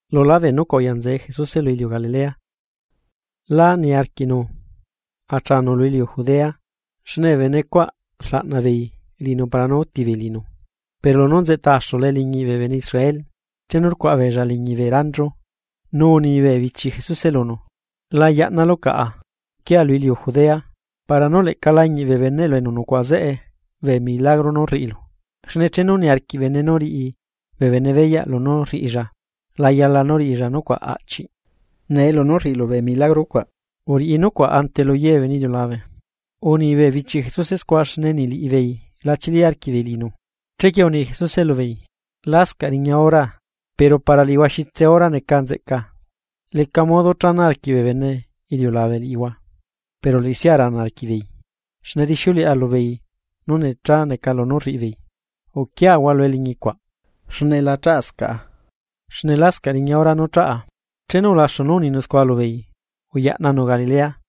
Lulá bee nucuaꞌ, uya Jesuse lu iliu Galilea. Lá niarquiꞌnu achaanu lu iliu Judea, xne bee bene cuaꞌ rlaꞌna beei liꞌinu para nú úti beei liꞌinu. Pero lunú nzeꞌta axula eliñiꞌ bee bene Israel, chenu rcuaꞌa beella liñi bee ranchu. Che uni bee bichi Jesuse lunu: ―La yaꞌnalu caꞌa, uquia lu iliu Judea, para nú leꞌca lañiꞌ bee beneꞌlu enu nucuaꞌa zeꞌe bee milagro nú rriꞌilu. Xne chenu niarquiꞌ bene nú riꞌi bee bene beyaꞌ lunú rriꞌilla, la yala nú riꞌilla nucuaꞌ aꞌchiꞌ. Nee lunú rriꞌilu bee milagro cuaꞌ, uriꞌi nucuaꞌ ante lu ye bee bene iliulabe. Uni bee bichi Jesuse scua xne niꞌ liꞌibeei la chili arquiꞌbeei liꞌinu. Chequie uni Jesuse lubeei: ―Lascaꞌ riña horaa, pero para liꞌihua xitse hora neca nzeꞌca. Leca modo chana arquiꞌ bee bene iliulabe liꞌihua, pero liꞌisia rana arquiꞌbeei, xne rixiuleꞌa lubeei nú necha neca lunú rriꞌi beei. Uquiahua lu eliñi cuaꞌ, xne la chaꞌscaꞌa, xne lascaꞌ riña hora nú chaꞌa. Chenu ulaxu nú uninu scua lubeei, uyaꞌnanu Galilea.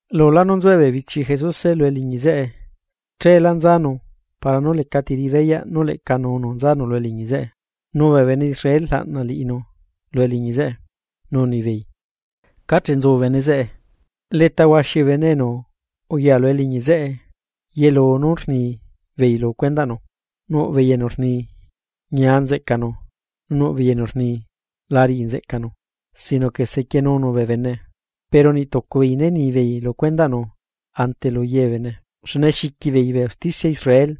Lulá nú nzue bee bichi Jesuse lu eliñi zeꞌe, cheelá nzanu para nú lecati riꞌi beyaꞌ nú leꞌca nunu nzanu lu eliñi zeꞌe. Nu bee bene Israel rlaꞌna liꞌinu lu eliñi zeꞌe, nu unibeei: ―¿Cáche nzu bene zeꞌe? Leta huaxi bee bene enu uya lu eliñi zeꞌe, yelu nú rnibeei lu cuendaꞌnu. Nuꞌ beei enu rni: “Ñia nzeꞌcanu”; nu nuꞌ beei enu rni: “La riꞌi nzeꞌcanu, sino que sequienunu bee bene.” Pero niꞌ tucu beei né ni beei lu cuendaꞌnu ante luye bee bene, xne xiqui beei bee usticia Israel.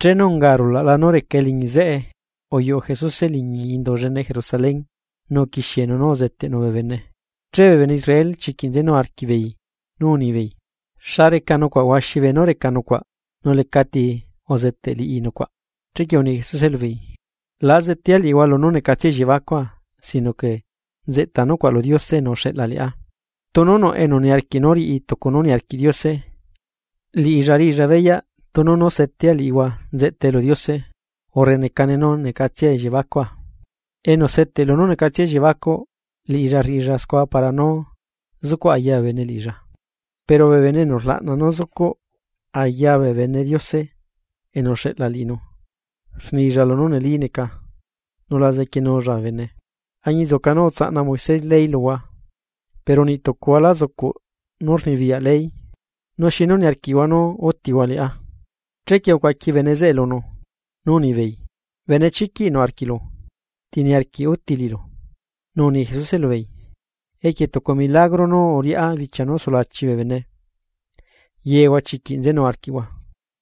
Chenu unga arulaꞌla nú reca eliñi zeꞌe, uyuꞌu Jesuse liñi indu llene Jerusalén, nu uquixienu nú uzeteꞌnu bee bene. Che bee bene Israel chiquiꞌ nzenu arquiꞌbeei nú unibeei: ―¿Xa reca nucuaꞌ huaxi beenú reca nucuaꞌ nu lecati uzeteꞌ liꞌi nucuaꞌ? Chequie uni Jesuse lubeei: ―La zetea liꞌihua lunú necatsia elliebacua, sino que nzeꞌta nucuaꞌ lu Diose enu uxeꞌla liꞌá. Tunu nuꞌ enu niarquiꞌ nú riꞌi tucu nú niarquiꞌ Diose, liꞌilla riꞌilla beyaꞌ tunu nú setea liꞌihua nzeꞌtae lu Diose, urre necane nú necatsia elliebacua. Enu seteꞌ lunú necatsia elliebacuꞌ, liꞌilla rriꞌilla scua para nú zucuꞌ aya bee bene liꞌilla. Pero bene enu rlaꞌna nú zucuꞌ aya bee bene Diose enu uxeꞌla liꞌinu, rnilla lunú neli neca, nu la zequienulla bee bene. ’Añinzuca nú utsaꞌna Moisés ley luhua, pero niꞌ tucuhua, la zucuꞌ nú rnibiyaꞌ ley. ¿Nu xinu niarquiꞌhua nú útihua liꞌá? Chequie ucuaqui bee bene zeꞌe lunu nú unibeei: ―¡Benechiquiꞌ nuꞌ arquiꞌlu! ¿Ti niarquiꞌ úti liꞌilu? Nu uni Jesuse lubeei: ―Equie tucu milagro nú uriꞌá bichia nú sulachi bee bene, yehua chiquiꞌ nzenu arquiꞌhua.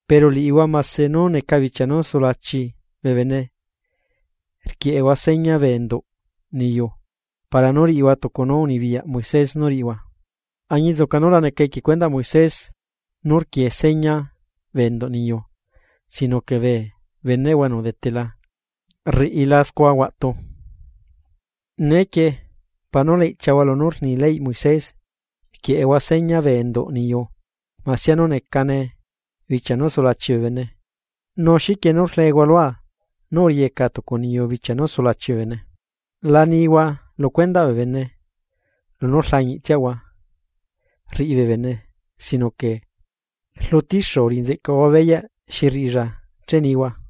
Pero liꞌihua mase nú neca bichia nú sulachi bee bene rquieꞌehua seña bee enduꞌ meꞌhua para nú riꞌihua tucu nú unibiyaꞌ Moisés nú riꞌihua, añinzuca nú la neca equie cuendaꞌ Moisés nú rquie seña bee enduꞌ meꞌhua sino que bee beneꞌhua enu udetela rriꞌila scua huatu. Neequie, para nú la iꞌchiahua lunú rni leyꞌ Moisés rquieꞌehua seña bee enduꞌ niyu masia nú necane bichia nú sulachi bee bene. Nu, ¿xiquie nú rlehua lua nú uriyeca tucu niyu bichia nú sulachi bee bene? La nihua lu cuendaꞌ bee bene lunú rlañiꞌtsiahua rriꞌi bee bene sino que rlutixu uriꞌinzeꞌcahua beyaꞌ xi rriꞌilla che nihua.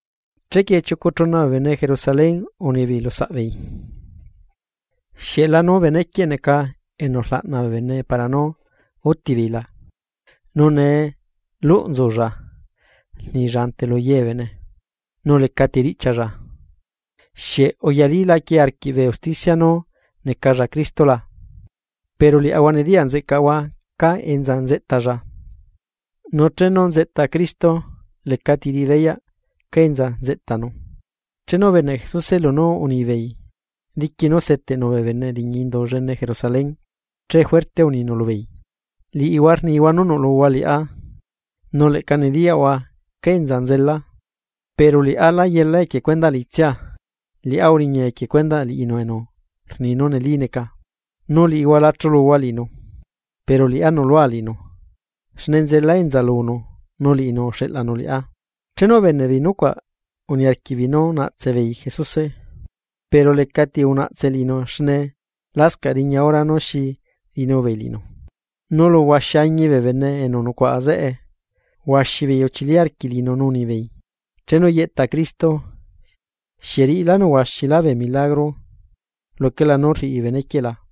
Chequie chiucu chuna bee bene Jerusalén unibeei lu saꞌbeei: ―¿Xieꞌ lanu benequieꞌ neca enu rlaꞌna bee bene para nú úti beei la? Nu nee luꞌ nzulla rnilla ante lu ye bee bene, nu lecati riꞌchialla. ¿Xieꞌ uyalílaquie arquiꞌ bee usticia nú necalla Cristo la? Pero liaꞌahua nediyaꞌ nzeꞌcaꞌahua cá enza nzeꞌtalla, nu chenu nzeꞌta Cristo, lecati riꞌibeyaꞌ cá enza nzeꞌtanu. Chenu ubeneꞌ Jesuse lunú rnibeei, diqui nú seteꞌnu bee bene liñi Indu llene Jerusalén, che juerte uninu lubeei: ―Liꞌihua rnihua nú nuꞌluhua liꞌá, nu leꞌca nediyaꞌhua cá enza nzela, pero liꞌá lá yelá equie cuendaꞌ liꞌitsia. Liꞌá uriña equie cuendaꞌ liꞌinu enu rni nú neli neca, nu liꞌihua la chuluhua liꞌinu. Pero liꞌá nuꞌlua liꞌinu, xne nzela enza lunu nu liꞌinu uxeꞌlanu liꞌá. Chenu ubeneꞌbeei nucuaꞌ uniarquiꞌbeei nú naꞌtse beei Jesuse, pero lecati unaꞌtse liꞌinu xne lascaꞌ riña hora nú xi riꞌinu beei liꞌinu. Nulu huaxi añi bee bene enu nucuaꞌa zeꞌe, huaxi beei uchili arquiꞌ liꞌinu nu unibeei: ―Chenu yeꞌta Cristo, ¿xieꞌ riꞌilanu huaxilá bee milagro luquelá nú rriꞌi benequieꞌ la?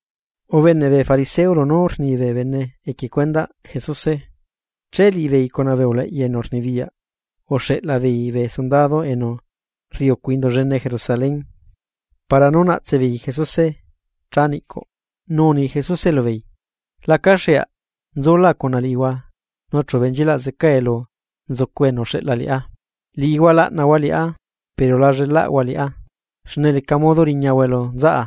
Ubeneꞌ bee fariseo lunú rni bee bene equie cuendaꞌ Jesuse. Che liꞌibeei cuna bee uleꞌya enu rnibiyaꞌ, uxeꞌla beei bee sundadu enu rriꞌi ucu Indu llene Jerusalén para nú naꞌtse beei Jesuse cha niꞌcuꞌ. Nu uni Jesuse lubeei: ―Lacaxeaꞌ nzula cuna liꞌihua nu chu benchilaꞌ zeca elu nzucu enu uxeꞌla liꞌá. Liꞌihua laꞌnahua liꞌá pero la llelaꞌhua liꞌá, xne leca modo riñahua elu nzaꞌa.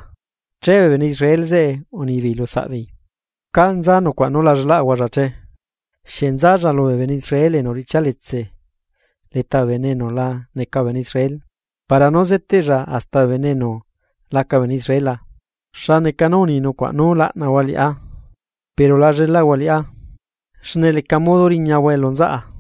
Che bee bene Israel zeꞌe unibeei lu saꞌbeei: ―¿Cá nza nucuaꞌ nú la llelaꞌahualla che? ¿Xieꞌ nzalla lubee bene Israel enu uriꞌchialetse leta bee bene enu la neca bee bene Israel para nú zeteꞌlla hasta bee bene enu laca bee bene Israel la? ¿Xa neca nú uni nucuaꞌ: “Nú laꞌnahua liꞌá pero la llelaꞌhua liꞌá, xne leca modo riñahua elu nzaꞌa”?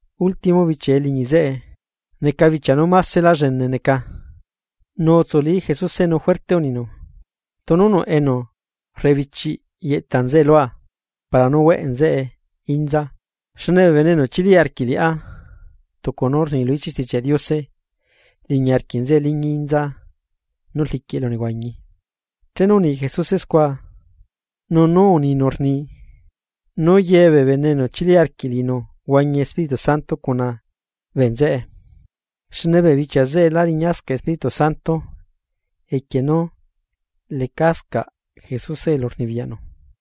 Ultimo bichia eliñi zeꞌe, neca bichia nú másela llene neca nu utsuli Jesuse nu juerte uninu: ―Tunu nuꞌ enu rebichiꞌ yeꞌta nzeꞌe lua para nú hueꞌ nzeꞌe inza. Xne bee bene enu chili arquiꞌ liꞌá, tucu nú rni lu ichiꞌ Stichiaꞌ Diose, liñi arquiꞌ nzeꞌe liñi inza nú rliquiꞌ elunehuañi. Chenu uni Jesuse scua. Nu nú uninu rni, nú yebee bene enu chili arquiꞌ liꞌinu huañi Espíritu Santo cuna bee nzeꞌe, xne bee bichia zeꞌe lá riñascaꞌ Espíritu Santo equie nú lecascaꞌ Jesuse elu rnibiyaꞌnu.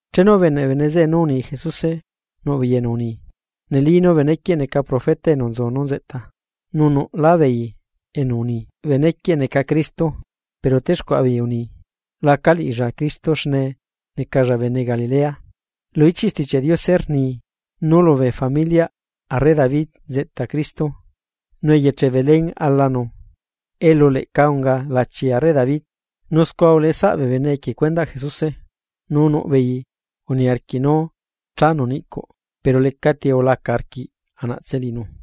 Chenu ubeneꞌ bee bene zeꞌe nú uni Jesuse, nuꞌbeei enu uni: ―Neli nú benequieꞌ neca profeta enu nzu nú nzeꞌta. Nu nuꞌlá beei enu uni: ―Benequieꞌ neca Cristo. Pero texcuaꞌa beei uni: ―Laca liꞌilla Cristo xne necalla bene Galilea. Lu ichiꞌ Stichiaꞌ Diose rni nú lubee familiaꞌ arre David nzeꞌta Cristo, nu eyeche Belén alanu elu leꞌca unga lachi arre David. Nu scua uleꞌesaꞌ bee bene equie cuendaꞌ Jesuse. Nu nuꞌbeei uniarquiꞌ nú chanu niꞌcuꞌ, pero lecati ulaca arquiꞌ anaꞌtse liꞌinu.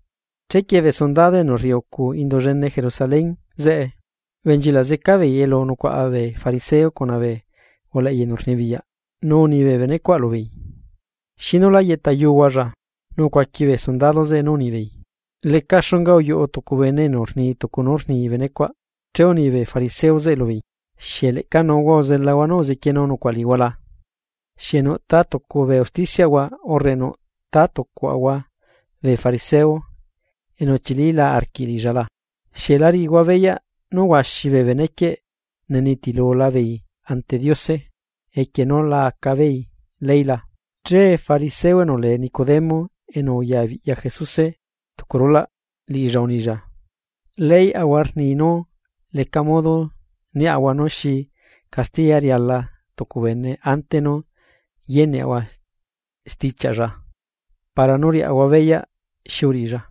Chequie bee sundado enu rriucu Indu llene Jerusalén zeꞌe, ubenchilaꞌ zeca beei elu nucuaꞌa bee fariseo cuna bee uleꞌya enu rnibiyaꞌ, nu uni bee bene cuaꞌ lubeei: ―¿Xinu lá yeꞌtayuhualla? Nu ucuaqui bee sundado zeꞌe nú unibeei: ―Leca xunga, uyuꞌu tucu bene enu rni tucu nú rni benecuaꞌ. Che uni bee fariseo zeꞌe lubeei: ―¿Xieꞌ leꞌca nuhua uzelahua nú uzequienu nucuaꞌ liꞌihua la? ¿Xieꞌ nuꞌtátucu bee usticiaꞌahua urre nuꞌ tátucuaꞌahua bee fariseo enu uchilila arquiꞌ liꞌilla la? ¿Xieꞌ la riꞌihua beyaꞌ nú huaxi bee benequieꞌ nenitilula beei ante Diose, equie nú la aca beei ley la? Che fariseo enu lee Nicodemo enu uyabiꞌya Jesuse tucu reché, liꞌilla unilla: ―Leyꞌahua rni nú leca modo niaꞌahua nú xi castiya riala tucu bene ante nú yeneꞌahua stichiaꞌlla para nú riaꞌahua beyaꞌ xi uriꞌilla.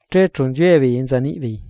Che chu nziue beei enza niꞌbeei.